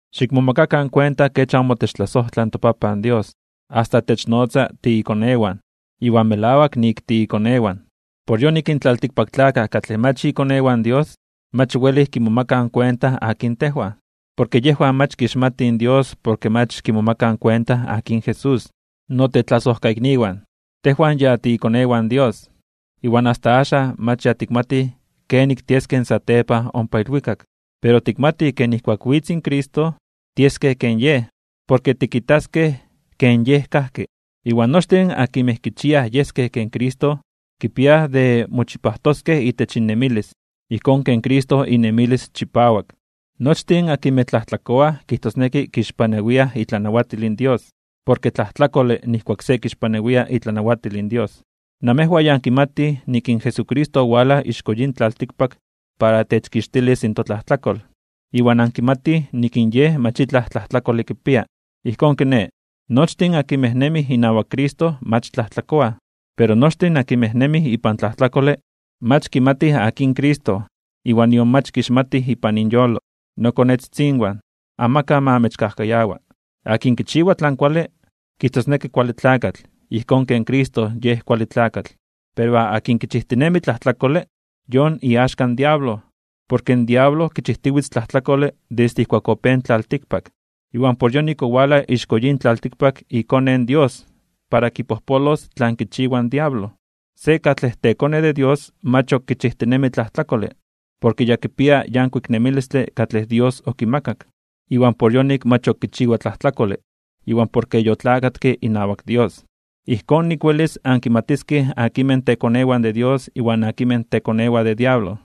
Xikmomakakan kuenta kech amo techtlasojtla in toPapan Dios, asta technotza tiikonewan, iwan melawak nik tiikonewan. Por yonik in tlaltikpaktlakaj katlej mach ikonewan in Dios, mach welij kimomakaj kuenta akin tejwan, porke yejwan mach kixmatij Dios porke mach kimomakaj kuenta akin Jesús. Notetlasojkaikniwan, tejwan ya titekonewan de Dios. Iwan asta axan mach ya tikmatij kenik tieskej satepan ompa ilwikak. Pero tikmatij ke nijkuak witz in Cristo, tieskej ken Yej, porke tikitaskej ken Yej kajki. Iwan nochtin akinmej kichiaj yeskej ken Cristo, kipia de mochipajtoskej itech innemilis, ijkón ken Cristo inemilis chipawak. Nochtin akinmej tlajtlakoaj kijtosneki kixpanawiaj itlanawatil in Dios. Porke tlajtlakole nijkuak se kixpanawia itlanawatil in Dios. Namejwan ya ankimatij nik in Jesucristo owalaj ixko yin tlaltikpak para techkixtilis in totlajtlakol, iwan ankimatij nik in Yej mach itlaj tlajtlakole kipia. Ijkón kiné, nochtin akinmej nemij inawak Cristo mach tlajtlakoaj. Pero nochtin akinmej nemij ipan tlajtlakole, mach kimatij akin Cristo iwan nion mach kixmatij ipan inyolo. Nokonetzitzinwan, amakaj ma amechkajkayawa. Akin kichiwa tlan kuale, kijtosneki kuale tlakatl ijkón ken Cristo Yej kuale tlakatl. Pero akin kichijtinemi tlajtlakole, yon iaxka in diablo, porke in diablo kichijtiwitz tlajtlakole desde ijkuak opéj in tlaltikpak. Iwan por yonik owalaj ixko yin tlaltikpak iKone in Dios para kipojpolos tlan kichiwa in diablo. Se katlej tekone de Dios mach ok kichijtinemi tlajtlakole, porke ya kipia yankuik nemilistle katlej Dios okimakak, iwan por yonik mach ok kichiwa tlajtlakole, iwan porke yotlakatke inawak Dios. Ijkón nik welis ankimatiskej akinmej tekonewan de Dios iwan akinmej tekonewan de diablo.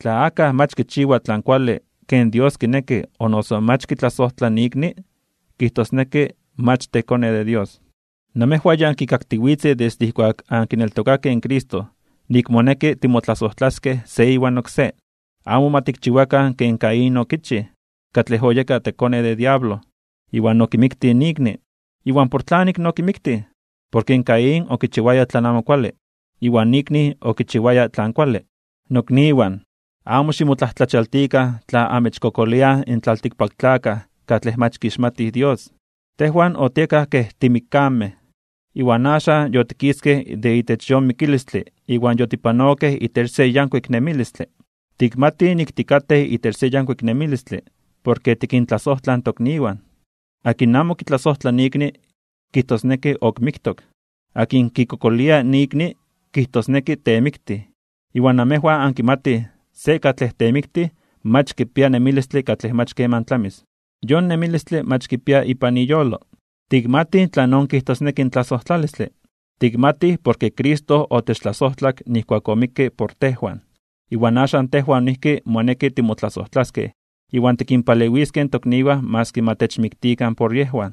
Tla akaj mach kichiwa tlan kuale ken Dios kineki o noso mach kitlasojtla ikni, kijtosneki mach tekone de Dios. Namejwan ya ankikaktiwitzej desde ijkuak ankineltokakej in Cristo nik moneki timotlasojtlaskej se iwan oksé. Amo ma tikchiwakan ken Caín okichij, katlej oyeka tekone de diablo, iwan okimiktij ikni. ¿Iwan por tlanik okimiktij? Porke in Caín okichiwaya tlan amo kuale, iwan ikni okichiwaya tlan kuale. Nokniwan, amo ximotlajtlachialtikan (ximomajmawtikan) tla amechkokoliaj in tlaltikpaktlakaj katlej mach kixmatij Dios. Tejwan otiekaj kej timikkamej, iwan axan yotikiskej de itech yon mikilistle iwan yotipanokej itech se yankuik nemilistle. Tikmatij nik tikatej itech se yankuik nemilistle porke tikintlasojtlaj in tokniwan. Akin amo kitlasojtla ikni, kijtosneki ok miktok. Akin kikokolia ikni kijtosneki temiktij, iwan namejwan ankimatij se katlej temiktij mach kipia nemilistle katlej mach keman tlamis. Yon nemilistle mach kipia ipan iyolo. Tikmatij tlanon kijtosneki in tlasojtlalistle. Tikmatij porke Cristo otechtlasojtlak nijkuak omikke por tejwan. Iwan axan tejwan noijki moneki timotlasojtlaskej iwan tikinpalewiskej in tokniwan maski ma techmiktikan por yejwan.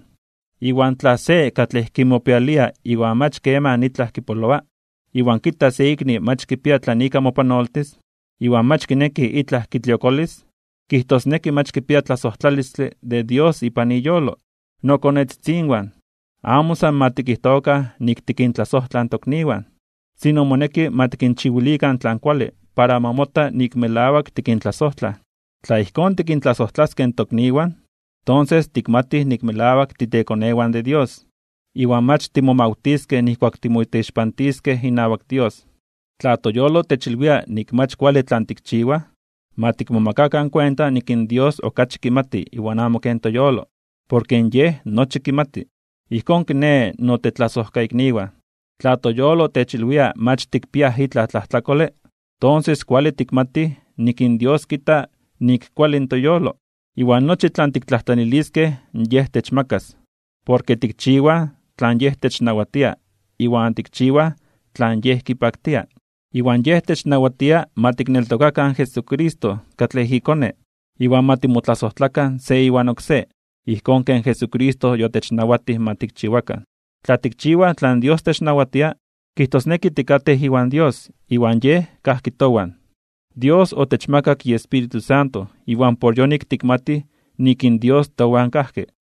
Iwan tla se katlej kimopialia iwan mach keman itlaj kipoloa, iwan kita se ikni mach kipia tlan ika mopanoltis, iwan mach kineki itlaj kitliokolis, kijtosneki mach kipia tlasojtlalistle de Dios ipan iyolo. Nokonetzitzinwan, amo san ma tikijtokan nik tikintlasojtlaj in tokniwan, sino moneki ma tikinchiwilikan tlan kuale para ma mota nik melawak tikintlasojtlaj. Tla ijkón tikintlasojtlaskej in tokniwan, tonses tikmatij nik melawak titekonewan de Dios, iwan mach timomawtiskej nijkuak timoteixpantiskej inawak Dios. Tla toyolo techilwia nik mach kuale tlan tikchiwaj, ma tikmatikan nik in Dios okachi kimati iwan amo ken toyolo, porke Yej nochi kimati. Ijkón kiné, notetlasojkaikniwan, tla toyolo techilwia mach tikpiaj itlaj tlajtlakole, tonses kuale tikmatij nik in Dios kita nik kuale in toyolo. Iwan nochi tlan tiktlajtlaniliskej Yej techmakas, porke tikchiwaj tlan technawatia iwan tikchiwaj tlan Yej kipaktia. Iwan Yej technawatia ma tikneltokakan in Jesucristo katlej iKone, iwan ma timotlasojtlakan se iwan oksé, ijkón ken Jesucristo yotechnawatij ma tikchiwakan. Tla tikchiwaj tlan Dios technawatia, kijtosneki tikatej iwan Dios iwan Yej kajki towan. Dios otechmakak iEspíritu Santo iwan por yonik tikmatij nik in Dios towan kajki.